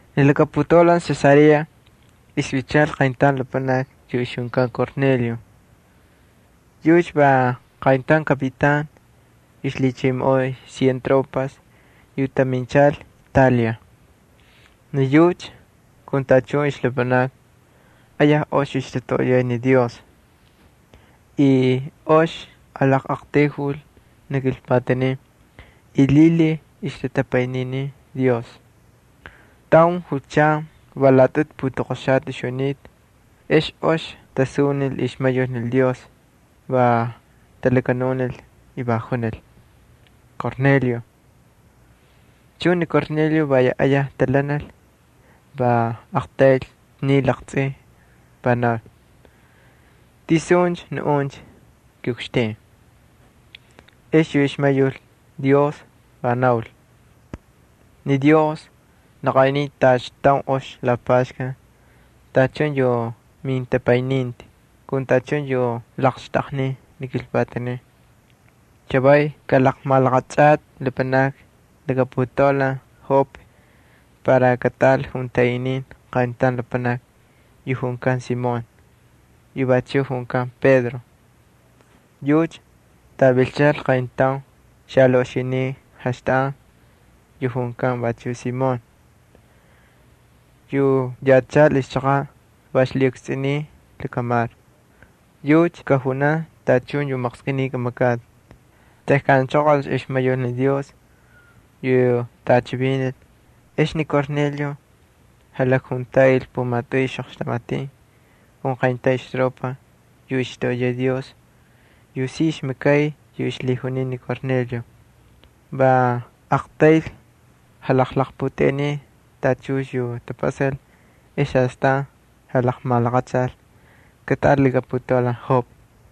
Ni laka putaulan Cesarea ixvilchal qayntaun lapanaki yu ixjunkan Cornelio. Yucha va qayntaun kapitan yu ixlhichimoꞌoy cien tropas yu taminchal Italia. Ni yucha kun tachun ixlapanakni ayaj ox ixtatoꞌoyay ni Dios. Y ox jalaqꞌaqtayjul ni kilpatanin y lhilhiy ixtatapayniniy Dios. Tauncha julchan va laꞌatꞌutu putoqoxata ixjunita, ex ox tasunil ixmayul ni Dios. Va talakanunil y va junil: —Cornelio. Chuncha ni Cornelio va ayaj talhanal, va aqtaylcha sniy laqtsꞌin, va naul: —¿Tisun naꞌuncha, kiꞌukxtin? Ex yu ixmayul Dios va naul: —Ni Dios laqaꞌinin tacha taun ox lapaxkan tachun yu mintapayniti kun tachun yu laqxtꞌaqnin ni kilpatanin. Chavay kꞌalaqmalaꞌachꞌatꞌi lapanakni laka putaulan Jope para kataꞌal juntaꞌinin qayntaun lapanaki yu junkan Simón yu vachuꞌ junkan Pedro. Yucha tꞌavilchal qayntaun xalaꞌoxiniꞌ jaxtaꞌan yu vachuꞌ junkan Simón, yu yachal ixchaqaꞌ va ixlhiꞌukstsꞌuniy lakamar. [Yucha kajunan tachun yu maqskꞌiniy kamakꞌatꞌi.] Tejkan anchoqolcha ixmayul ni Dios yu tꞌachivinil, ex ni Cornelio jalakjuntaꞌil pumatꞌuy ixꞌoqxtamatin kun qayntaun ixtropa yu ixtoꞌoyay Dios y ixmakay yu ixlhijuniy ni Cornelio. Va aqtayl jalaqputeꞌeniy tachun yu tapasal ex astan jalaqmalaqachalcha kataꞌal laka putaulan Jope.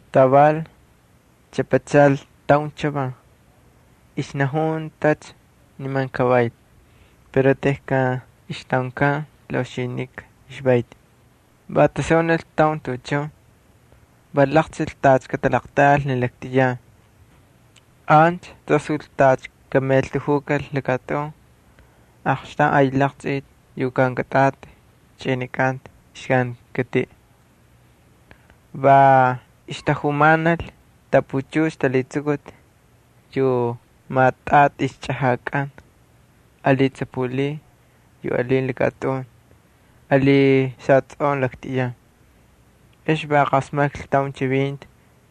Taval chꞌapachal taun chavan, ixnajuntacha niman kavayl. Pero tejkan ixtꞌaunkan laꞌoxinika ixvayti, va tasunil taun tuꞌuchun. Va laqtsꞌil tacha katalaqltiꞌal ni laktꞌiyan. Ancha tasul tacha kamaꞌeltajukal lakatꞌun aqxtaun ay laqchꞌiti yu kankatꞌati chꞌinikanta ixkankatiꞌ. Va ixtatajumanal tapuchux talhitsukuti yu maꞌatꞌati ixchꞌajakꞌan ali tsapulin yu alin lakatꞌun ali xatsꞌoꞌon laktꞌiyan. Ex va qasmaklhi taun chivinti,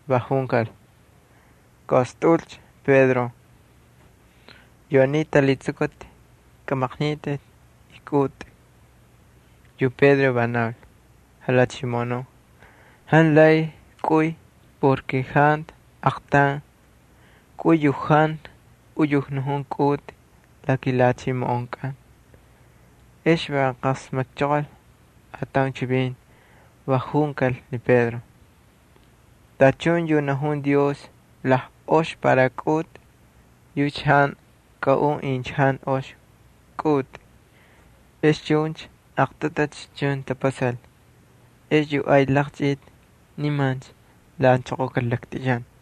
va junkal: —Kaꞌostꞌaꞌulcha, Pedro. Yu aniy talhitsukuti kꞌamaqnitꞌi y kꞌaꞌutꞌi. Yu Pedro va naul: —Jalhachimoꞌonuꞌ, jantu lay kꞌuy. Jantu aqtaun kꞌuy yu jantu uyujnajun kꞌaꞌutꞌi la kilhachimoꞌonkꞌan. Ex va qasmakchoqol ataun chivinti, va junkal ni Pedro: —Tachun yu najun Dios lajꞌox para kꞌaꞌutꞌi yucha jantu kꞌaꞌun incha jantu ox kꞌaꞌutꞌi. Ex chuncha aqtꞌutu chuncha tapasal. Ex yu ay laqchꞌiti nimancha lhaꞌanchoqokal laktꞌiyan.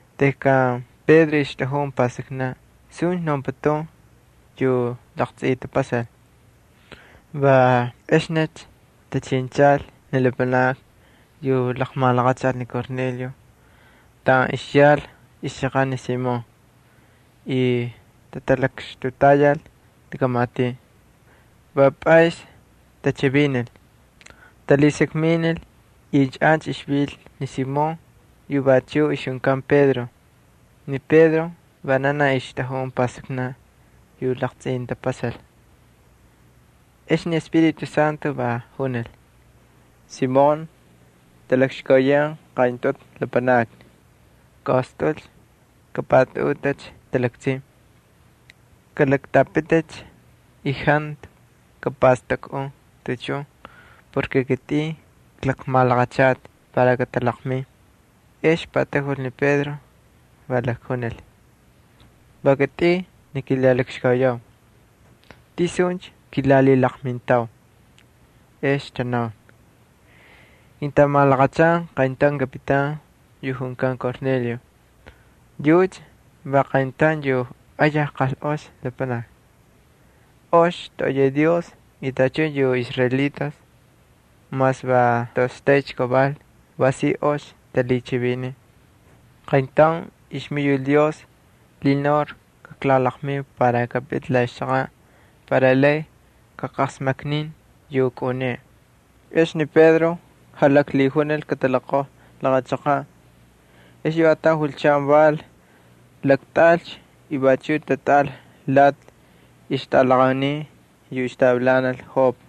Tejkan Pedro ixtꞌajun pastaknaꞌ suncha naunputun yu laqtsꞌitapasal, va exnicha tachinchal ni lapanakni yu laqmalaqachal ni Cornelio taꞌan ixyal ixchaqaꞌ ni Simón y tatalakxtutayal laka matiꞌ. Va pꞌaysni tachivinil, talhasakminil incha ancha ixvil ni Simón yu vachuꞌ ixjunkan Pedro. Ni Pedro vananaj ixtꞌajun pastaknaꞌ yu laqtsꞌitapasal. Ex ni Espíritu Santo va junil: —Simón, talakxkauyan qayntꞌutu lapanakni. Kaꞌostꞌaꞌulcha, kapꞌatꞌaꞌutꞌicha talaktsin. Kalaktꞌapiticha y jantu kapastakꞌun tuꞌuchun, va kitꞌin klaqmalaqachata para katalaqmin. Ex patajul ni Pedro, va lakjunil: —Va kitꞌin ni kilalakxkauyau. ¿Tisuncha kilalhilaqmintau? Ex tanaul: —Kintamalaqachan qayntaun kapitan yu junkan Cornelio. Yucha va qayntaun yu ayaj qalꞌox lapanaki. Ox toꞌoyay Dios y tachun yu israelitas mas va toꞌoxtaycha kaval va si ox talhichiviniy. Qayntaun ixmayul Dios lhinaul kaklalaqmiu para kapiti la ixchaqaꞌ para lay kaqasmaknin yu kꞌaꞌuneꞌe. Ex ni Pedro jalaklhijunil kataloqojlhi laqa chaqaꞌ. Ex yu ataun julchan val, laktꞌaꞌalcha y vachuꞌ tatꞌaꞌal lati ixtꞌalaqaunin yu ixtavilanal Jope.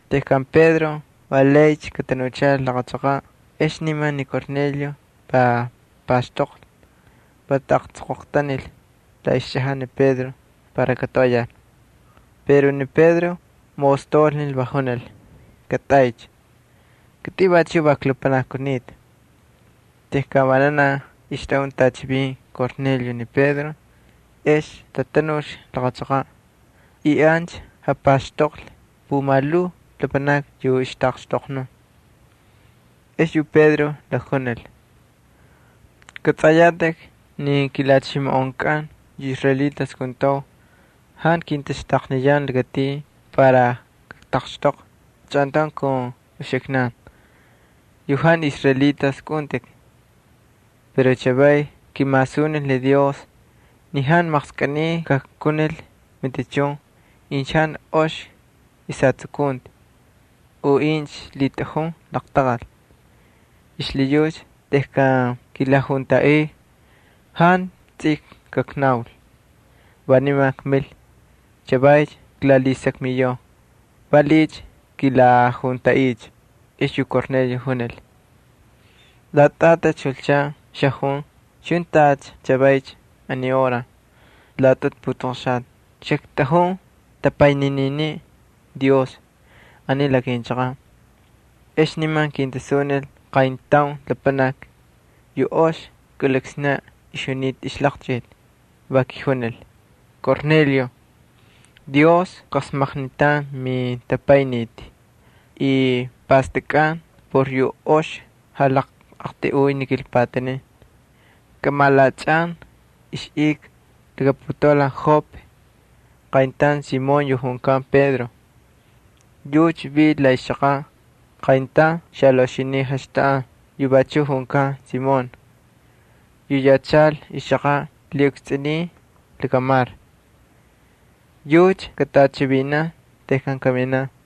Tejkan Pedro va laycha katanuchal laqa chaqaꞌ exnicha ni Cornelio va paxtoqlhi, va taꞌaqtsoqoqtanil la ixchꞌajaꞌ ni Pedro para katoꞌoyal. Pero Pedro maꞌostaulnil, va junil: —Katꞌaycha. Kitꞌin vachuꞌ va lapanaki kunita. Tejkan vananaj ixtꞌajun tꞌachivin Cornelio ni Pedro ex tanulcha laqa chaqaꞌ y ancha japaxtoqlhi pumalhuu lapanakni yu ixtaꞌaqxtoqnun. Ex yu Pedro lakjunil: —Kꞌatsꞌayatꞌikcha ni kilhachimoꞌonkꞌan yu israelitas kuntau jantu kintaxtaqniyan lakatin para kaktaqxtoqvi chꞌantaun kun uxiknan yu jantu israelitas kꞌaꞌuntꞌik. Pero chavay kimasunil ni Dios ni jantu maqskꞌiniy kajkunil matichun incha jantu ox ixjatsukunti u incha lhitꞌajun laqtaqal. Xlhiyucha tejkan kilajuntaꞌiu, jantu tsij kaknaul, va niman kmil. Chavaycha klalhisakmiyau ¿Valiꞌiycha kilajuntaꞌiucha? Ex yu Cornelio junil: —Laꞌatꞌaticha julchan xajun chuncha tacha chavaycha aniy hora laꞌatꞌutu putoqoxata xaktꞌajun tapaynininiꞌ Dios aniy la kinchaqaꞌ. Ex niman kintasunil qayntaun lapanaki yu ox kꞌuliksnaꞌ ixjunita ixlaqchꞌiti. Va kijunil: “Cornelio, Dios qasmaknitan mintapayniti y pastakꞌan por yu ox jalaqꞌaqtꞌayꞌuy ni kilpatanin. Kꞌamalaꞌachꞌan ixꞌika laka putaulan Jope qayntaun Simón yu junkan Pedro. Yucha vil la ixchaqaꞌ qayntaun xalaꞌoxiniꞌ jaxtaꞌan yu vachuꞌ junkan Simón yu vil ixlhiꞌukstsꞌuniy lakamar. [Yucha katꞌachivinanan tejkan kaminaꞌ.]”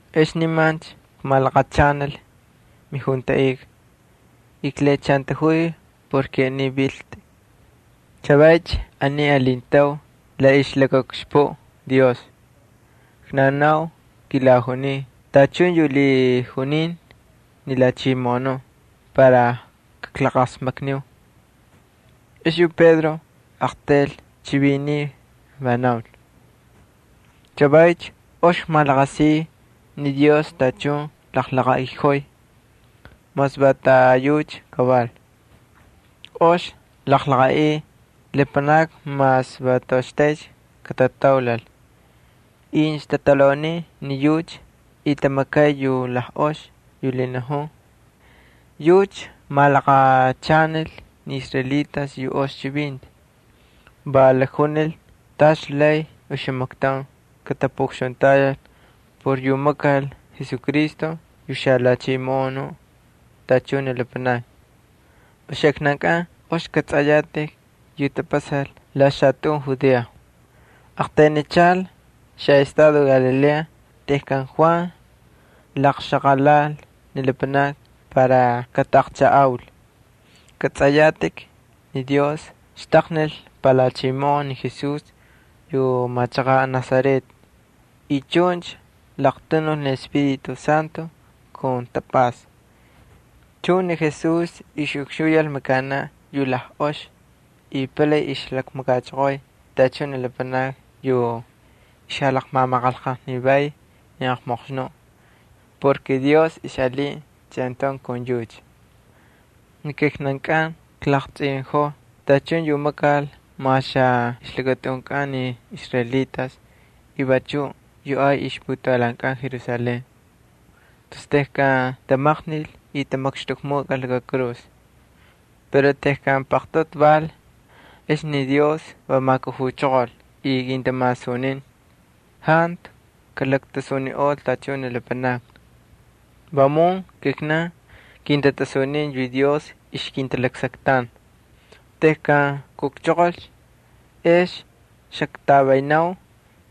Ex niman kmalaqachanal mijuntaꞌika y klhiꞌachantajuy ni aniycha viltꞌi. Chavaycha aniy alintau la ixlakaꞌukxpuꞌ Dios. Knaunau kilajuniu tachun yu lhijunin ni Jalhachimoꞌonuꞌ para kaklaqasmakniu. Ex yu Pedro aqtayl chiviniy, va naul: —Chavaycha ox kmalaqasiy ni Dios tachun jalaqaꞌiꞌojoy mas va taꞌayucha kaval. Ox jalaqaꞌiy lapanakni mas va toꞌoxtaycha katataulal incha tatalhauniy ni yucha y tamakay yu lajꞌox yu lhinajun. Yucha laqmalaqachanil ni israelitas yu ox chivinti. Va jalakjunil tacha lay oxamaktaun katapuꞌukxuntayal por yu makal Jesucristo yu xaJalhachimoꞌonuꞌ tachun ni lapanakni. Uxiknankꞌan ox kꞌatsꞌayatꞌik yu tapasal la xalakatꞌun Judea. Aqtaynichal xaꞌestado Galilea tejkan Juan laqxaqalal ni lapanakni para kataꞌaqchajꞌaul. Kꞌatsꞌayatꞌik ni Dios xtaqnil palhachimoꞌon ni Jesús yu machaqaꞌ Nazaret y chuncha laqtanul ni Espíritu Santo kun tapꞌasta. Chuncha ni Jesús ixꞌukxuyal makanaꞌ yu lajꞌox y palay ixjalakmakachoqoy tachun ni lapanakni yu ixjalaqmamaqanlqajnivay ni aqmoqxnuꞌ porke Dios ixꞌalinta chꞌantaun kun yucha. ’Ni kijnankꞌan klaqtsꞌinꞌojoo tachun yu makal mas la ixtꞌunkꞌan ni israelitas y vachuꞌ yu ay ixputaulankꞌan Jerusalén, tus tejkan tamaqnil y tamakxtꞌukmukꞌal laka kurus. Pero tejkan paqtꞌutu val, ex ni Dios va majkujuchoqol y kintamasunin. Jantu kalaktasuniꞌol tachun ni lapanakni. Vamun kijnan kintatasunin yu Dios ixkintalaksaktan. Tejkan kujchoqolcha, ex xaktꞌavaynau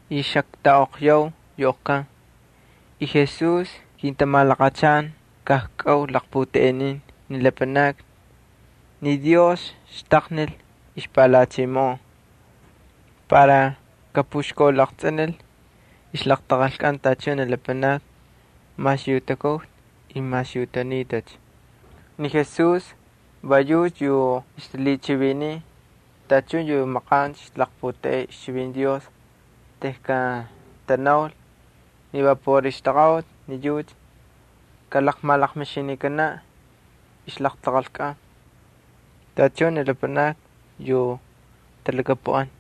y xaktꞌaꞌoqyau yu oqkan. Jesús kintamalaqachan kajkꞌau jalaqputeꞌeninin ni lapanakni ni Dios xtaqnil ixpalhachimoꞌon para kapuxkaulaqtsꞌinil ixlaqtaqalkꞌan tachun ni lapanakni mas yu takujta y mas yu tanitacha. Ni Jesús va yucha yu ixtalhichiviniy tachun yu maqancha ixtalaqputeꞌey ixchivinti Dios tejkan tanaul ni va por ixtaqaꞌuti ni yucha kalaqmalaqmixinikanaꞌ ixlaqtaqalkꞌan tachun ni lapanakni yu talhakapuꞌan.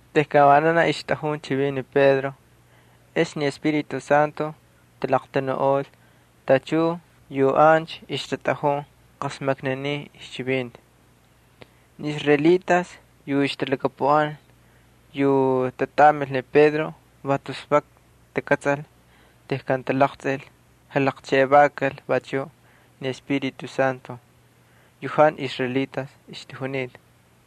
Tejkan vananaj ixtꞌajun chivin ni Pedro, ex ni Espíritu Santo talaqtanuꞌol tachun yu ancha ixtatꞌajun qasmakninin ixchivinti. Ni israelitas yu ixtalhakapuꞌan yu tatꞌamil ni Pedro va tus vak takꞌatsal tejkan talaqtsꞌil jalaqxtaqnikal vachuꞌ ni Espíritu Santo yu jantu israelitas ixtajunita.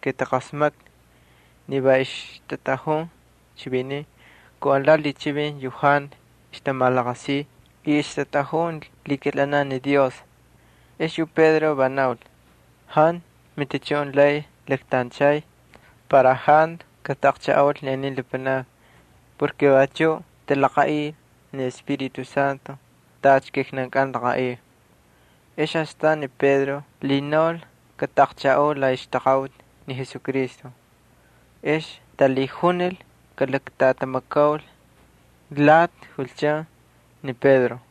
Taqasmaklhi ni va ixtatꞌajun chivinin kun alati lhichivin yu jantu ixtamalaqasiy y ay ixtamakay ni Dios. Ex yu Pedro va naul: —Jantu matichun lay laktanchay para jantu kataꞌaqchajꞌaul ni aniy lapanakni. Vachuꞌ talaqaꞌil ni Espíritu Santo tacha kijnankꞌan klaqaꞌiu. Ex astan ni Pedro lhinaul kataꞌaqchajꞌaul la ixtaqaꞌuti ni Jesucristo. Ex talhijunil kalaktꞌatamakaul lati julchan ni Pedro.